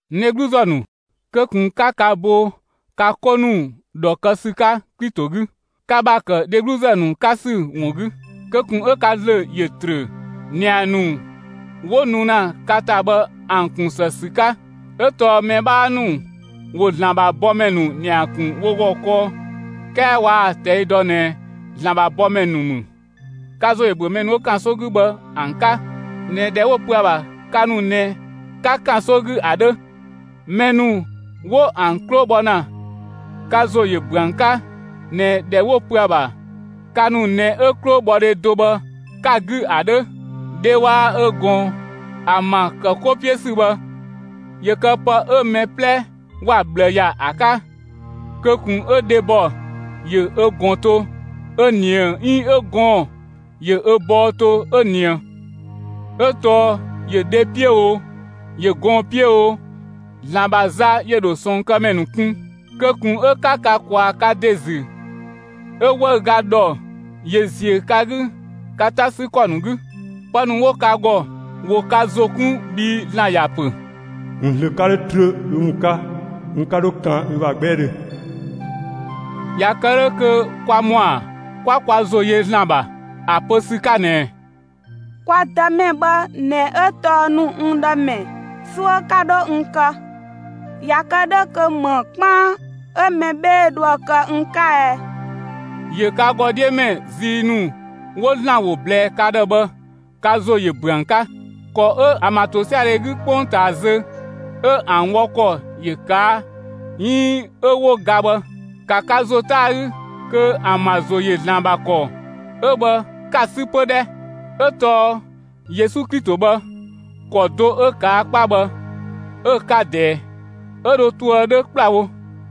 (N dhegluzë ‑nu,) kö ꞊kun 'ka ka bo ka 'ko ‑nu ‑dhɔ kë ‑sü 'ka Klito 'gü, ka ‑bha ‑kë dhegluzë ‑nu 'ka ‑sü ‑wun 'gü! Kö ꞊kun 'ö ka ‑zlö ‑yö ‑trö ‑nia ‑nu 'wo nu ‑na ka ‑ta bhë ‑an ‑kun ‑së ‑sü 'ka; 'ö tɔɔ mɛ 'bhaa ‑nu ‑wo ‑Zlan ‑bha bɔmɛ ‑nu ‑nia ‑kun wo ‑gɔ kɔɔ, 'kɛɛ waa‑ ꞊tɛi' dɔ ꞊nɛ ‑Zlan ‑bha bɔmɛ ‑nu ‑mü. Ka ‑zo ‑yö ‑büö mɛ ‑nu 'wo ‑kanso 'gü bhë ‑an 'ka ꞊nɛ ‑dhɛ 'wo‑ pö ‑a ‑bha ka ‑nu ꞊nɛ ka ‑kanso 'gü ‑a 'dhö. Mɛ ‑nu 'wo ‑an 'klo bho ‑na, ka ‑zo ‑yö ‑büö ‑an 'ka ꞊nɛ ‑dhɛ 'wo‑ pö ‑a ‑bha ka ‑nu ꞊nɛ 'ö 'klobhɔdhe do bhë 'ka‑ 'gü ‑a 'dhö. Dhe waa‑ ö ꞊gɔn ‑an ‑bha ‑kë 'ko 'piö ‑sü bhë, ‑yö kë pë 'ö mɛ 'plɛ ‑wa ꞊bhlë ‑ya ‑a 'ka; kö ꞊kun 'ö dhebɔ ‑yö ö ꞊gɔn to 'ö ꞊nië 'iin ö gɔɔn‑ ‑yö ö bɔɔ to 'ö ꞊nië. 'Ö tɔɔ ‑yö dhe 'piö o, ‑yö gɔɔn‑ 'piö o, ‑Zlan ‑bha za ‑yö ‑dho ꞊sɔɔnkëmɛ ‑nu kun. Kö ꞊kun 'ö 'ka ka ꞊kwaa‑ ka ‑de ‑zü 'ö 'wëüga ‑dhɔ ‑yö ‑ziö ka 'gü ka 'ta 'sü ‑kɔ ‑nu 'gü. Pë ‑nu 'wo ka ‑gɔ ‑wo ka ‑zo 'kun bhii ‑Zlan ‑ya ‑pö: N ‑zlö 'ka 'dho trö ü ‑wun 'ka, n 'ka 'dho kan ü ‑bha 'gbɛɛdhö. ꞊Ya kë 'dhö kö kwa ‑mɔa 'kwa kwa ‑zo yö ‑Zlan ‑bha ‑a pö ‑sü 'ka ꞊nɛ: Kwa Dëmɛ bhë ꞊nɛ 'ö tɔɔ ‑nu n ‑dhë ‑mɛ; 'suö 'ka 'dho n kë. ꞊Ya kë 'dhö kö ‑më 'kpaan 'ö mɛbheedhe dhoë‑ kë n 'ka ɛ? ‑Yö ka ‑gɔ 'dhiö mɛ zii ‑nu 'wo ‑Zlan ‑wo ꞊blɛɛ ka ‑dhë bhë, ka ‑zo ‑yö ‑büö ‑an 'ka. ‑Kɔ 'ö ‑an ‑bha ‑tosiadhe 'gü 'kpongtaa zö 'ö ‑an wɔ ‑kɔ ‑yö ꞊kaa' 'iin 'ö 'wo ga bhë, ‑ka ka ‑zo 'ta ‑a 'gü kö ‑an ‑bha ‑zo ‑yö ‑Zlan ‑bha ‑kɔ 'ö bhë 'ka‑ 'sü 'pö 'dhɛ! 'Ö tɔɔ Yesu Klito bhë, ‑kɔ do 'ö ꞊kaa' 'kpa bhë, 'ö‑ 'ka ꞊dɛɛ, 'ö dho toë 'dhö ‑kplawo.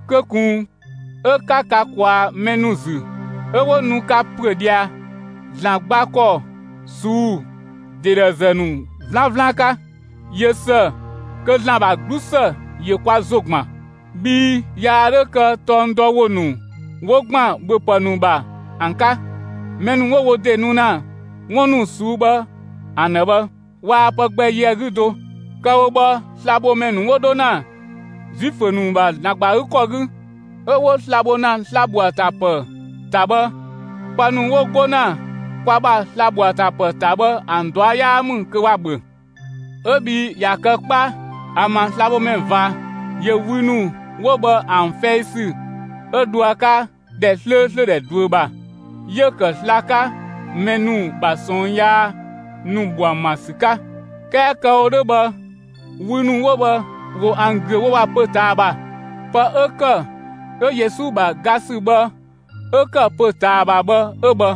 Kö ꞊kun 'ö 'ka ka ꞊kwaa‑ mɛ ‑nu ‑zü 'ö 'wo nu ka ‑püö ꞊dhia ‑Zlan gba ‑kɔ ꞊suu'‑ ‑de dhe ‑zë ‑nu 'vlanvlan 'ka. ꞊Yö ‑së kö ‑Zlan ‑bha 'glusë ‑yö kwa ‑zo ‑gban; bhii yaa 'dhö kë tɔng dɔ ‑wo ‑nu 'wo ‑gban ‑bhöpë ‑nu ‑bha ‑an 'ka. Mɛ ‑nu 'wo wo ‑de nu ‑na 'wun ‑nu ꞊suu'‑ bhë ‑an ‑dhë bhë, waa pë gbɛ yö ‑a 'gü do. Kë‑ wo bhë, slabhomɛ ‑nu 'wo 'dho ‑na Zuifö ‑nu ‑bha ‑Zlan ‑gba ‑a 'gü ‑kɔ 'gü, 'ö 'wo sla‑ bho ‑na sla‑ ‑bho ‑a ‑ta ‑pë ‑ta bhë, pë ‑nu 'wo 'go ‑na kwa ‑bha sla‑ ‑bho ‑a ‑ta ‑pë ‑ta bhë ‑an ꞊dua' 'yaa ‑mü kö ‑wa ‑bhö. 'Ö bhii ꞊ya kë 'kpa, ‑an ‑bha slabhomɛ ꞊va ‑yö wü ‑nu 'wo bhë ‑an fɛi ‑sü 'ö dho ‑a 'ka ‑dhɛ 'slööslö ‑dhɛ ꞊duö ‑bha, 'yö‑ ‑kë sla‑ 'ka mɛ ‑nu ‑bha ꞊sɔɔn yaa ‑nu ‑bho ‑an ‑bha ‑sü 'ka. 'Kɛɛ kë‑ wo 'dhö bhë, wü ‑nu 'wo bhë, ‑wo ‑an ‑güö wo ‑bha pö‑ ꞊taa ‑bha. Pë 'ö ‑kë 'ö Yesu ‑bha ga ‑sü bhë 'ö ‑kë pö‑ ꞊taa bhë 'ö bhë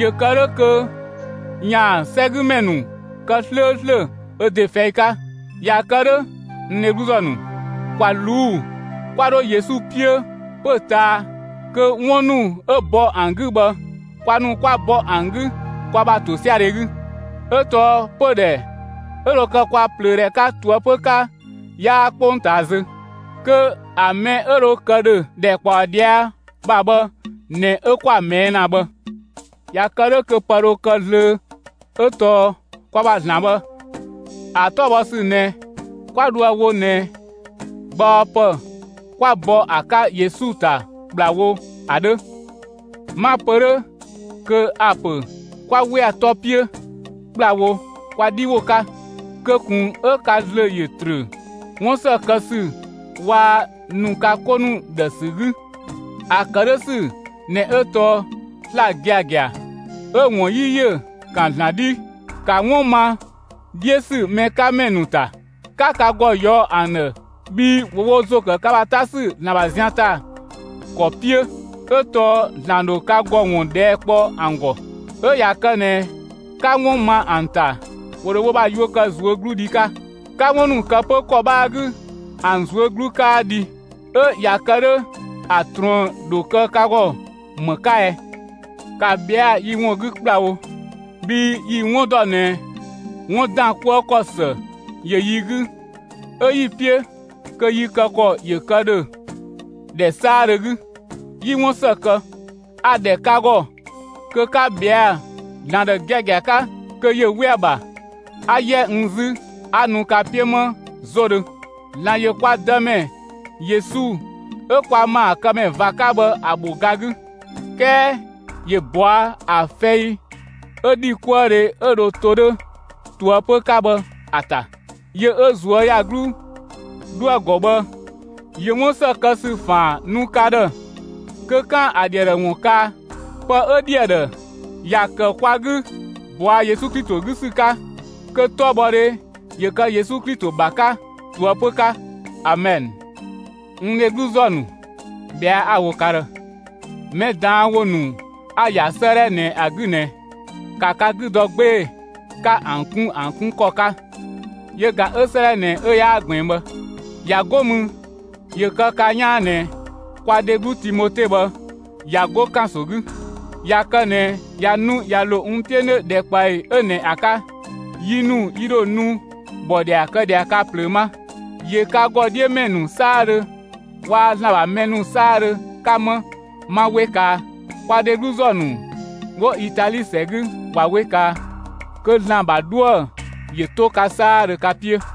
‑yö kë 'dhö kö ‑yaan 'sɛgümɛ ‑nu kë 'slööslö ö ‑de fɛi 'ka. ꞊Ya kë 'dhö, (n dhegluzë ‑nu,) ‑kwa ꞊luu'‑ 'kwa 'dho Yesu 'piö pö‑ ꞊taa kö 'wun ‑nu 'ö bɔ ‑an 'gü bhë, kwa ‑nu 'kwa bɔ ‑an 'gü kwa ‑bha ‑tosiadhe 'gü. 'Ö tɔɔ pödhɛ 'ö dho kë kwa ꞊plöödhɛ 'ka ꞊toëpö 'ka 'yaa 'kpongtaa zö. Kö ‑a mɛ 'ö dho kë ‑dhö ‑dhɛkpaɔ ꞊dhia' ‑bha bhë ꞊nɛ 'ö 'kwa‑ ꞊mɛɛ' ‑na bhë. ꞊Ya kë 'dhö kö pë dho kë zlöö 'ö tɔɔ kwa ‑bha ‑Zlan bhë, ‑a 'tɔbhɔsü ꞊nɛ, 'kwa dhoë‑ wo ꞊nɛ gbaɔpë 'kwa bɔ ‑a 'ka Yesu ‑ta ‑kplawo ‑a 'dhö. 'Ma‑ pö 'dhö kö a‑ ‑pö 'kwa 'we ‑a 'tɔ 'piö ‑kplawo kwa 'dhi ‑wo 'ka. Kö ꞊kun 'ö ka ‑zlö ‑yö ‑trö 'wun ‑së kë ‑sü waa‑ ‑nu ka 'ko ‑nu ‑dhë ‑sü 'gü. ‑A ‑kë 'dhö ‑sü ꞊nɛ 'ö tɔɔ sla‑ giagia 'ö‑ ‑wun 'yi ‑yö ‑kan ‑Zlan 'dhi. ‑Ka 'wun ma 'dhiö ‑sü mɛ 'ka ‑mɛ ‑nu ‑ta, 'ka ka ‑gɔ ꞊yɔɔ' ‑an ‑dhë bhii ‑wo wo ‑zo ‑kë ka ‑bha 'ta ‑sü ‑Zlan ‑bha zian ‑ta ‑kɔ 'piö; 'ö tɔɔ ‑Zlan ‑dho ka ‑gɔ ‑wun ꞊dhɛɛ' kpɔ ‑an ‑gɔ. 'Ö ꞊ya kë ꞊nɛ 'ka 'wun ma ‑an ‑ta, ‑wo ‑dho wo ‑bha yuö kë ꞊zuögludhi 'ka. 'Ka 'wun ‑nu kë 'pö ‑kɔ 'bhaa 'gü, ‑an ꞊zuö' 'glu 'kaa dhi; 'ö ꞊ya kë 'dhö ‑a ꞊truën‑ ‑dho kë ka ‑gɔ ‑më 'ka ɛ? ‑Ka ꞊bhɛa' yi ‑wun 'gü ‑kplawo, bhii yi‑ 'wun ‑dɔ ꞊nɛ 'wun ‑dan 'kuë ‑kɔ ‑së ‑yö yi 'gü 'ö 'yi‑ 'piö kö yi kë ‑kɔ ‑yö kë ‑dhö ‑dhɛ 'saadhö 'gü, 'yi 'wun ‑së kë. A‑ ‑dhɛ ka ‑gɔ kö 'ka ꞊bhɛa' ‑Zlan ‑dhë giagia 'ka kö ‑yö 'we ‑a ‑bha, 'a 'yɛ n 'zü 'a nu ka 'piö 'ma 'zodhö. ‑Zlan ‑yö kwa Dëmɛ Yesu 'ö kwa ‑maakëmɛ ꞊va 'ka bhë ‑a ‑bho ga 'gü. 'Kɛɛ ‑yö ꞊bɔa' ‑a fɛi 'ö ‑dhikuëdhe 'ö dho to 'dhö ꞊toëpö 'ka bhë ‑a ‑ta. Yö 'ö ꞊zuöyagluu 'dhoë‑ ‑gɔ bhë ‑yö 'wun ‑së kë ‑sü ‑faan nu ka ‑dhë kö 'kaan‑ ‑a ‑dhi ‑a ‑dhë ‑wun kaa. Pë 'ö ‑dhi ‑a ‑dhë, ‑ya ‑kë kwa 'gü bɔa Yesu Klito 'gü ‑sü 'ka. Kö 'tɔbhɔdhe ‑yö kë Yesu Klito ‑bha 'ka ꞊toëpö 'ka! Amɛn. N dhegluzë ‑nu, ꞊bhɛa' 'a‑ wo ka ‑dhë: Mɛ ꞊daan' ‑wo ‑nu 'a‑ ‑ya 'sëëdhɛ ꞊nɛ ‑a 'gü ꞊nɛ, ‑ka ka 'gü dɔ 'gbee‑ 'ka ‑an 'kun ‑an 'kun ‑kɔ 'ka, yö ꞊ga 'ö 'sëëdhɛ ꞊nɛ 'ö yaa ꞊gbiin bhë. ꞊Ya 'go mü, ‑yö kë ka 'yaan ꞊nɛ kwa dheglu Timote bhë ꞊ya 'go ‑kanso 'gü; ꞊ya kë ꞊nɛ ꞊ya nu ꞊ya ‑lo n 'piö 'nö ‑dhɛkpaɔyi 'ö ꞊nɛ ‑a 'ka, yi ‑nu yi ‑dho nu ‑bhɔdhia kë ꞊dhia ka ꞊plöö 'ma. ‑Yö ka ‑gɔ 'dhiö ‑mɛ ‑nu 'saadhö waa‑ ‑Zlan ‑bha mɛ ‑nu 'saadhö 'ka 'ma, 'ma 'we kaa. Kwa dhegluzë ‑nu 'wo Itali ‑sɛ 'gü ꞊wa 'we kaa. Kö ‑Zlan ‑bha 'dhuë‑ ‑yö 'to ka 'saadhö ka 'piö!